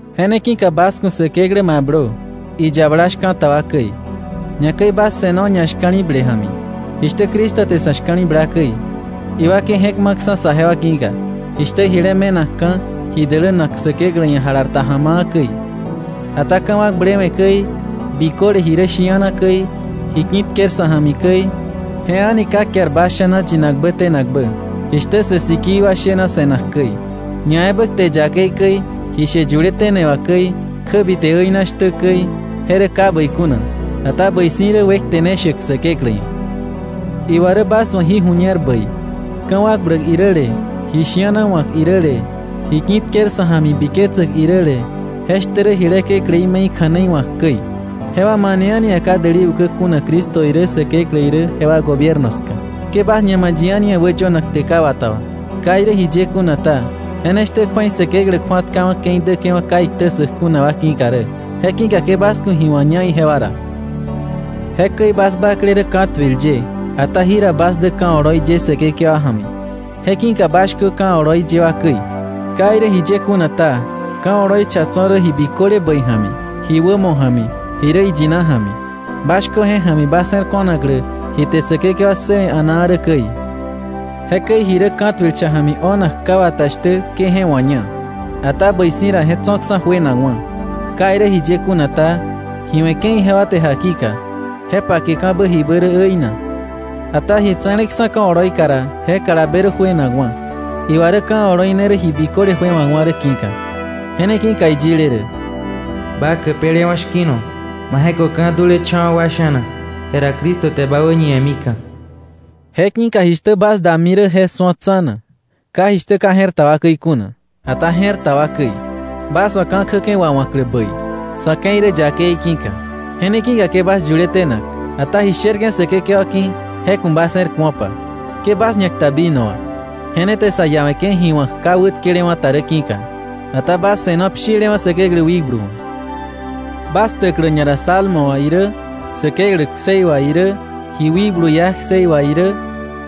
Je ne ki̱ka bas ku̱ Säkeklä mablö, iyabala shka̱ta wa käi. Ñakäi bas se̱no ñashka̱li̱ble ja̱mi, jishtä Cristo te sa̱ shka̱li̱bla käi, iwakei je̱k ma̱ksa̱ saje wa ki̱ka, jishtä jile me̱nakka̱, ji dälänak Säkeklä ia̱ jalar ta ja̱ma̱a̱ käi. Ata ka̱wakblewe̱ käi, biköle ji rä shi̱ana käi, ji ki̱tker sa̱ ja̱mi käi, je a̱ni ka kiar bas sha̱na yinakbä tenakbä, jishtä sä sikii wa shena se̱nak käi, ñaebä kte yakei käi, ji she yuletene wà käi, kjäbite äina shtä käi, je rä ka bäi kuna, ata bäi si̱ rä wekte ne shäk Säkeklä ia̱. Iwa rä bas wa̱ jí ju̱ñer bäi: Ka̱wakbläk iräle, ji shi̱ana wa̱k iräle, ji ki̱tker sa̱ ja̱mi biketsäk iräle, je shtä rä jile kekläí me̱i kja̱nei wa̱k käi, jewa mane a̱ni ia̱ ka däli ukä kuna Cristo irä Säkeklä irä jewa gobierno ska. Ke bas ña ma̱ yi a̱ni ia̱ wäyönak kte ka wata wà. Ka irä jiye kuna ta, je ne shtä kju̱ei Säkeklä kju̱atkawa̱ ke̱i däke̱wa̱ ka iktä ssäk kuna wa ki̱ka rä. Je ki̱ka ke bas ku̱ ji wa̱ña ijewa ra. Jekäi bas bakle rä ka̱tuil ye, ata jira bas dä ka̱ oloi ye Säkekewa ja̱mi. Je ki̱ka bas shkö ka̱ oloi ye wa käi. Ka irä jiye kuna ta, ka̱ oloi cha tso̱ rä ji biköle bäi ja̱mi, ji wämo ja̱mi, ji rä iyina ja̱mi. Bas shkö je ja̱mi bas je̱r ko̱naklä ji te Säkekewa ssëwe̱ a̱naa rä käi. Jekäi ji rä ka̱tuil cha ja̱mi o̱nak ka wata shtä ke je wa̱ña. Ata bäi si̱ ra je tso̱ksa̱ juenakwa̱. Ka irä jiye kuna ta, ji we̱ke̱ ijewa te jakika, je pakeka̱bä jibä rä äina. Ata ji tse̱leksa̱ ka̱ oloika ra, je kalabe rä juenakwa̱. Iwa rä ka̱ oloi ne rä ji biköle juewa̱kwa̱ rä ki̱ka. Je ne ki̱ka iyile rä: “Ba käpelewa̱ shki̱no, ma je̱köka̱ dulecha̱wa̱ wa sha̱na, jera Cristo te bä wäñiwe̱mika̱.” Je ki̱ka jishtä bas dami rä, je su̱o tsa̱na, ka jishtä ka je̱r ta wa käi kuna, ata je̱r ta wa käi, bas wa̱ ka̱ kjäke̱ wawa̱klä bäi, sa̱ ke̱i rä yakei ki̱ka. Je ne ki̱ka ke bas yuletenak, ata ji sherke̱ Säkekewa ki̱ je ku̱ bas je̱r ku̱opa. Ke bas ñakta vino wà. Je ne te sa iawe̱ke̱ ji wa̱k ka wätkelewa̱ ta rä ki̱ka. Ata bas se̱no pshilewa̱ Säkeklä wikblu wa̱. bas ktäklä ñara salmo wà irä, Säkeklä ksei wà irä, ji wikblu iá kseí wà irä,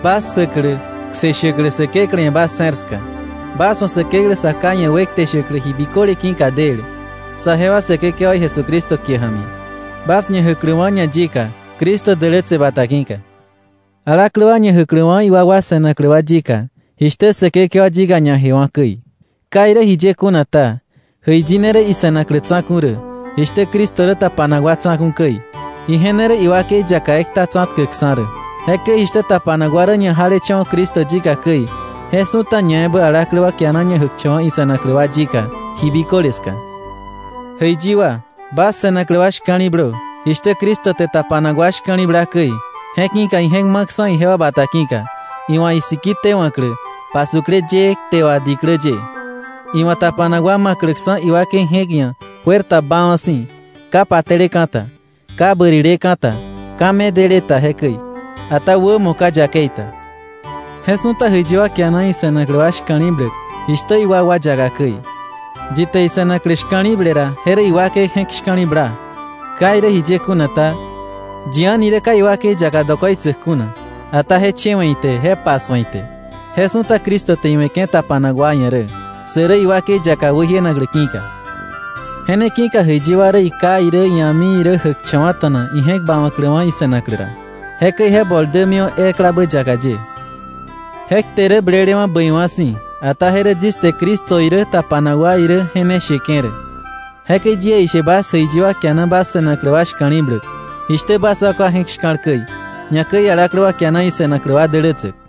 bas ksäklä, kse shäklä Säkeklä ia̱ bas je̱r ska, bas wa̱ Säkeklä Sa Ká ia̱ wekte shäklä ji biköle ki̱ka del, saje wa Säkekewaí Jesucristo kie ja̱mi, bas ñajäkläwa̱ ñayika, Cristo dälätse bata ki̱ka, alaklä wa ñajäkläwa̱ iwakwa se̱naklä wa yika, jishtä Säkekewa yika ñajewa̱ käi. Ka irä jiye kuna ta, jäiyi ne rä ise̱naklä tsa̱ku̱ rä, jishtä Cristo rä tapanak wa tsa̱ku̱ käi. Ije ne rä iwakei yaka ekta tsa̱tkäkksa̱ rä. Jekäi jishtä tapanak wa rä ñajalecha̱wa̱ Cristo yika käi, je su̱ta ñaebä alaklä wa kiana ñajäkcha̱wa̱ ise̱naklä wa yika ji biköle ska. Jäiyi wa, bas se̱naklä wa shka̱li̱blö, jishtä Cristo te tapanak wa shka̱li̱bla käi, je ki̱ka ije̱k ma̱ksa̱ ijewa bata ki̱ka, iwa̱ isiki tewa̱klä, pasukle yëë kte wà diklä ye, iwa̱ tapanak wa ma̱kläksa̱ iwakei je̱k ia̱ juer ta baawa̱ si̱, ka pate̱leka̱ ta, ka bärileka̱ ta, ka medele ta jekäi, ata wämo ka yakei ta. Je su̱ta jäiyi wa kiana ise̱naklä wa shka̱li̱bläk jishtä iwakwa yaka käi. Yi te ise̱naklä shka̱li̱ble ra, je rä iwakei je̱k shka̱li̱bla. Ka irä jiye kuna ta, yi a̱ni rä ka iwakei yaka dokoitsäk kuna, ata je chewe̱ ite je pasu̱e ite. Je su̱ta Cristo te iwe̱ke̱ tapanak wa ia̱ rä, sä rä iwakei yaka wäjienaklä ki̱ka. “Je ne ki̱ka jäiyi wa rä iká irä ia̱mi irä jäkcha̱wa̱ta̱na ije̱k bawa̱kläwa̱ ise̱naklä ra, jekäi je bol dämiwa̱ eklabä yaka ye.” Je kte rä blelewa̱ bäiwa̱ si̱, ata je rä yis te Cristo irä tapanak wa irä je ne sheke̱ rä. Jekäi yie ishe bas jäiyi wa kiana bas se̱naklä wa shka̱li̱bläk, jishtä bas wakwa je̱k shka̱l käi, ñakäi alaklä wa kiana ise̱naklä wa dälätsäk.